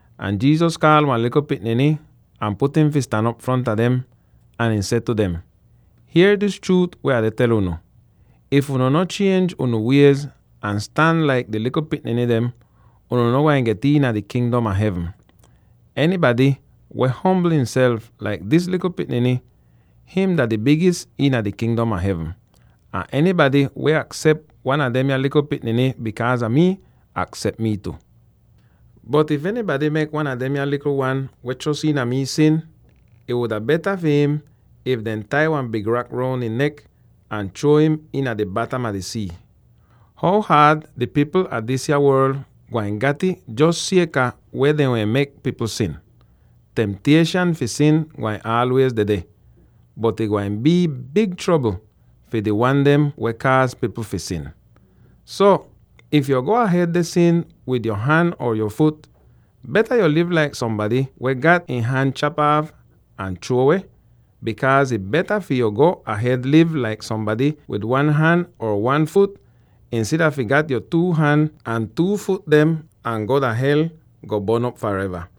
Ahn Jesus kaal wan likl pikniny ahn put im fi stan op fronta dem. Ahn ihn seh tu dem, “Hier dis chruut weh Ah deh tel unu: if unu no chienj unu wiez ahn stan laik di likl pikniny dem, unu no gwain get iina di Kingdom a Hevn. Enybady weh ombl ihnself laik dis likl pikniny, him dah di bigis iina di Kingdom a Hevn, ahn enybady weh aksep wan a demya likl pikniny bikaaz a mii, aksep mii tu. “Bot if enybady kaaz wan a demya likl wan weh chros iina mi fi sin, ih wuda beta fi im if dehn tai wan big rak roun ihn nek ahn chruo im iina di batam a di sii. How haad di pipl a disya worl gwain gat'ih jos sieka weh dehn mek pipl sin! Temtieshan fi sin gwain aalwiez dedeh, bot ih gwain bii big trobl fi di wan dem weh kaaz pipl fi sin! “So, if yu go ahed deh sin wid yo han or yo fut, beta yu liv laik sombady weh gat ihn han chap aaf ahn chruo weh, bikaaz ih beta fi yu go ahed liv laik sombady wid one han or one fut, insida fi gat yo two han ahn two fut dem ahn go dah hel, go bon'op fareva.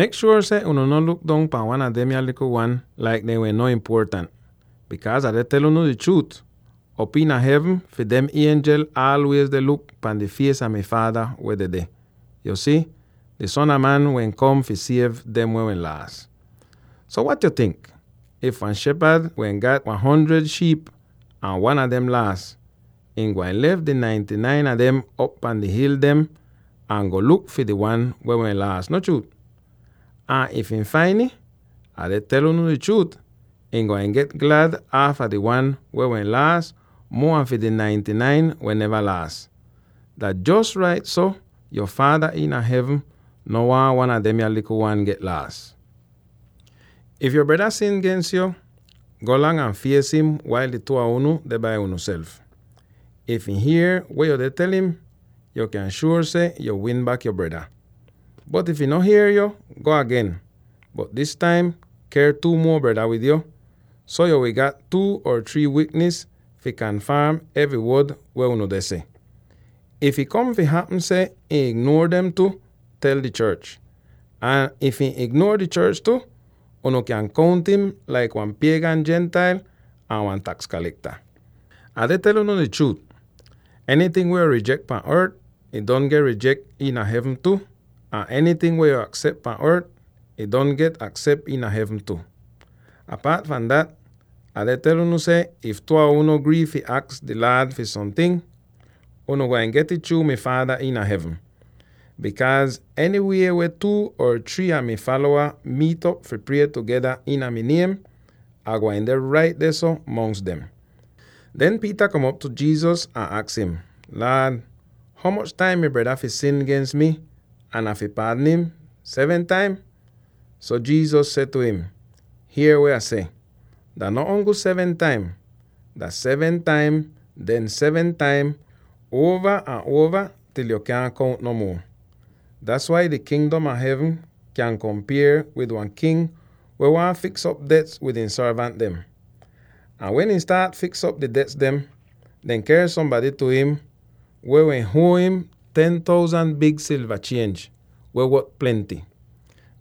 “Mek shuor seh unu no luk dong pahn wan a demya likl wan laik dem weh no impuotant, bikaaz Ah deh tel unu di chruut: Op iina hevn fi dem ienjel aalwiez deh luk pahn di fies a mi Faada weh dedeh. [Yo si, di Son a Man wehn kom fi siev dem weh laas.] “So wat yo tink? If wan shepad wehn gat wan hundred shiip ahn wan a dem laas, ihn gwain lef di ninety-nine a dem op pahn di hil ahn go luk fi di wan weh wehn laas, no chruut? Ahn if ihn fain ih —Ah deh tel unu di chruut— ihn gwain get glad aafa di wan weh wehn laas muo an fi di ninety-nine weh neva laas. Dah jos rait so, yo Faada iina hevn no waahn wan a demya likl wan get laas. “If yo breda sin gens yo, golang ahn fies im wail di two a unu deh bai unuself. If ihn hier weh yo deh tel im, yo kyan shuor seh yo win bak yo breda. Bot if ihn no hier yo, go agen, bot dis taim ker two muo breda wid yo, so yo wi gat two or three wiknis fi kanfaam evry wod weh unu deh seh. If, ih kom fi hapm seh ihn ignuor dem tu, tel di chorch. Ahn if ihn ignuor di chorch tu, unu kyan kount'im laik wan piegan Gentile ahn wan taks kalekta. “Ah deh tel unu di chruut: enyting weh yo rijek pahn ort, ih don get rijek iina hevn tu, ahn enyting weh yo aksep pahn ort, ih don get aksep iina hevn tu. Apaat fahn dat, Ah deh tel unu seh if two a unu grii fi aks di Laad fi somting, unu gwain get'ih chruu mi Faada iina hevn. Bikaaz enywie weh two or three a mi falowa miit'op fi prie tugeda iina mi niem, Ah gwain deh rait dehso mongs dem.” Den Peter kom op tu Jesus ahn aks im, “Laad, ho moch taim mi breda fi sin gens mi ahn Ah fi paadn im? Seven taim?” So Jesus seh tu im, “Hier weh Ah seh: dah no ongl seven taim; dah seven taim, den seven taim, uova ahn uova til yo kyaahn kount no muo! Or: “…dah seventy taim seven.” Das wai di Kingdom a Hevn kyan kompier wid wan king weh waahn fiks'op dets wid ihn sorvant dem. Ahn wen ihn staat fiks'op di dets dem, dehn ker sombady tu im weh wehn huo im ten thousand big silva chienj, weh wot plenty.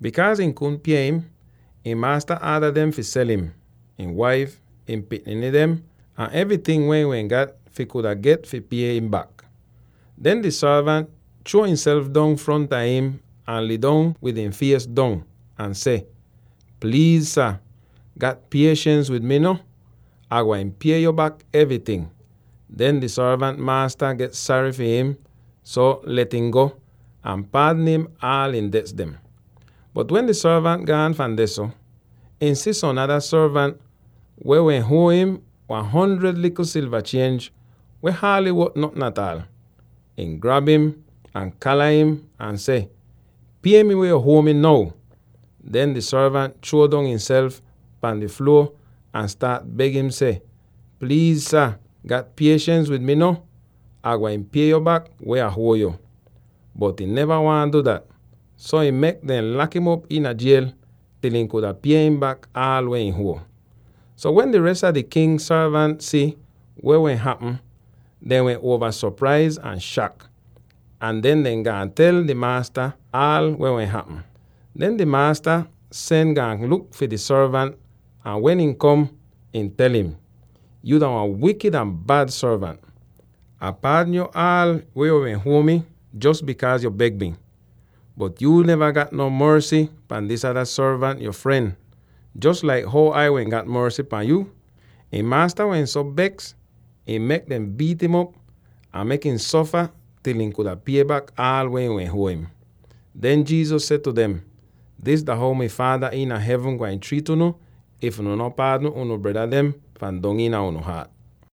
Bikaaz ihn kudn pie im, ihn maasta aada dem fi sel him, ihn waif, ihn pikniny dem, ahn evryting weh ihn wehn gat fi kuda get fi pie im bak. Den di sorvant chruo ihnself dong fronta im ahn lidong wid ihn fies dong, ahn seh, ‘Pliiz sah, gat pieshens wid mi, no; Ah gwain pie yo bak evryting!’ Den di sorvant maasta get sary far im, so let im go, ahn paadn aal ihn dets dem. “Bot wen di sorvant gaan fahn dehso, ihn si som nada sorvant weh wehn huo im wan hundred likl silva chienj, weh haaly wot notn ataal. Ihn grab im, ahn kala im, ahn seh, ‘Pie mi weh yo huo mi now!’ Den di sorvant chruo dong ihnself pahn di fluo ahn staat beg im seh, ‘Pliiz sah, gat pieshens wid mi no; Ah gwain pie yo bak weh Ah huo yo!’ Bot ihn neva waahn du dat, so ihn mek dem lak'im op iina jiel til ihn kuda pie im bak aal weh ihn huo. So, wen di res a di king sorvant si weh wehn hapm, dehn wehn uova sopraiz ahn shak, ahn den dehn gaan tel dehn maasta aal weh wehn hapm. Den di maasta sen gaan luk fi di sorvant ahn wen ihn kom, ihn tel im, ‘Yuu dah wan wikid ahn bad sorvant! Ah paadn yo aal weh yo wehn huo mi jos bikaaz yo beg mi. Bot yuu neva gat non morsy pahn di ada sorvant yo fren, jos laik how Ai wehn gat morsy pahn yo?’ Ihn maasta wehn so beks ihn mek dem biit'im op ahn mek ihn sofa til ihn kuda pie bak aal weh ihn wehn huo im.” Den Jesus seh tu dem, “Dis dah how mi Faada iina hevn gwain triit unu if unu no paadn unu breda dem fahn dong iina unu haat.”